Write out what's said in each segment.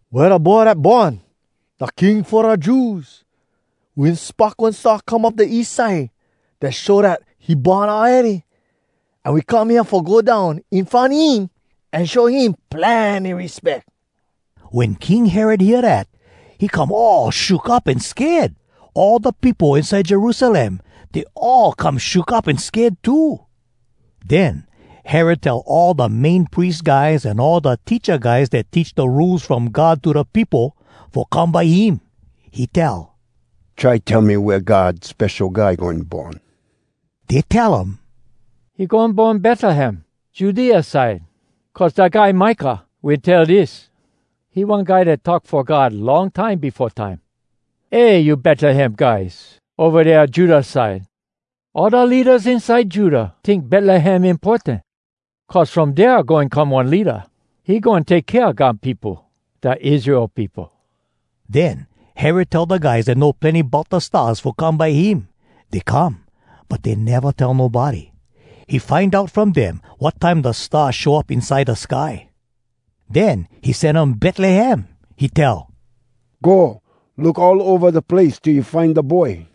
“Wea da boy dat born, da King fo da Jews? We wen spock one star come up da east side dat show dat he born awready, an we come hea fo go down in front him an show him plenny respeck.” Wen King Herod hear dat, he come all shook up an sked. All da peopo inside Jerusalem, dey all come shook up an sked too. Den Herod tell all da Main Pries guys an all da teacha guys dat teach da Rules From God to da peopo fo come by him. He tell, “Try tell me wea God Spesho Guy goin born.” Dey tell um, “He goin born Betlehem, Judea side. Cuz da guy Micah wen tell dis (he one guy dat talk fo God long time befo time): “‘Eh! You Betlehem guys, ova dea Judah side! All da leadas inside Judah Tink Betlehem importan. Cuz from dea goin come one leada. He goin take kea God peopo, Da Israel peopo.’” Den Herod tell da guys dat know plenny bout da stars fo come by him. Dey come, but dey neva tell nobody. He find out from dem wat time da star show up inside da sky. Den he sen um Betlehem. He tell, “Go! Look all ova da place till you find da boy.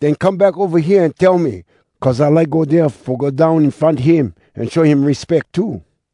Den come back ova hea an tell me. Cuz I like go dea fo go down in front him an show him respeck too.”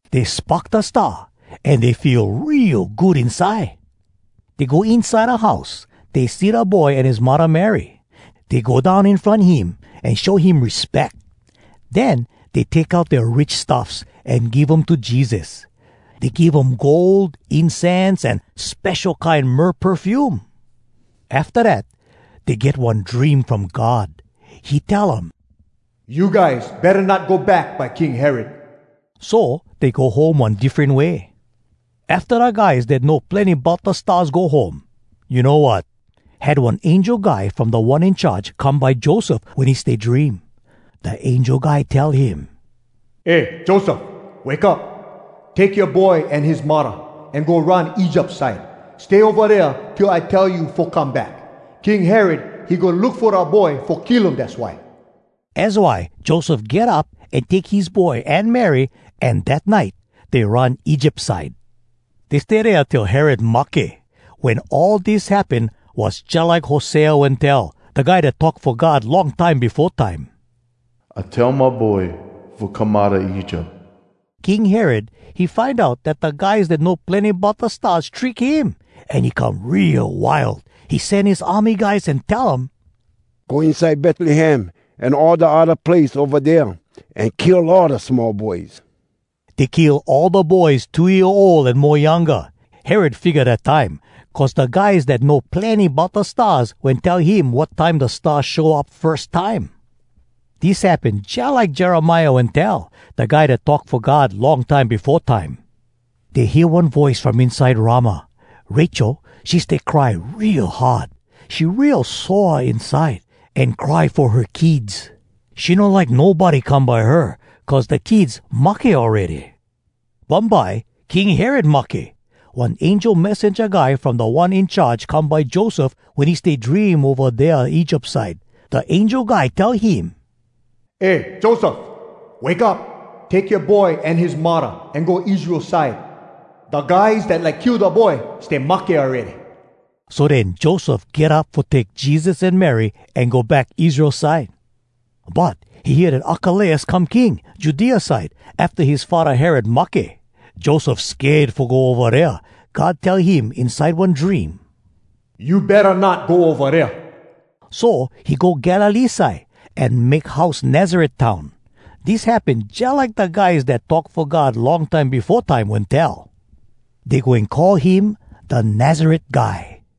Dey spock da star, an dey feel real good inside. Dey go inside da house. Dey see da boy an his muddah Mary. Dey go down in front him an show him respeck. Den dey take out dea rich stuffs, an give um to Jesus. Dey give um gold, incense, an spesho kine myrrh perfume. Afta dat dey get one dream from God. He tell um, “You guys betta not go back by King Herod.” So dey go home one diffren way. Afta da guys dat know plenny bout da stars go home, you know wat? Had one angel guy from Da One In Charge come by Joseph, wen he stay dream. Da angel guy tell him, “Eh Joseph! Wake up! Take yoa boy an his muddah, an go run Egypt side. Stay ova dea till I tell you fo come back. King Herod, he goin look fo da boy fo kill um dass why.” Az why Joseph get up, an take his boy an Mary, an dat nite dey run Egypt side. Dey stay dea till Herod mahke. Wen all dis happen, was jalike Hosea wen tell, da guy dat talk fo God long time befo time, “I tell my boy fo come outa Egypt.” King Herod, he find out dat da guys dat know plenny bout da stars trick him, an he come real wild. He sen his army guys an tell um, “Go inside Betlehem an all da odda place ova dea, an kill all da small boys.” Dey kill all da boys two year ol an mo younga. Herod figga dat time, cuz da guys dat know plenny bout da stars wen tell him wat time da star show up firs time. Dis happen jalike Jeremiah wen tell, da guy dat talk fo God long time befo time: “Dey hear one voice from inside Ramah, Rachel, she stay cry real hard, She real sore inside, An cry fo her kids, She no like nobody come by her, Cuz da kids mahke awready.” Bumbye, King Herod mahke. One angel messenja guy from Da One In Charge come by Joseph wen he stay dream ova dea Egypt side. Da angel guy tell him, “Eh Joseph! Wake up! Take yoa boy an his muddah, an go Israel side. Da guys dat like kill da boy, stay mahke awready.” So den Joseph get up fo take Jesus an Mary an go back Israel side. But he hear dat Arkelaus come king Judea side afta his faddah Herod mahke. Joseph sked fo go ova dea. God tell him inside one dream, “You betta not go ova dea.” So he go Galilee side, an make house Nazaret town. Dis happen jalike da guys dat talk fo God long time befo time wen tell, “Dey goin call him ‘da Nazaret guy.’”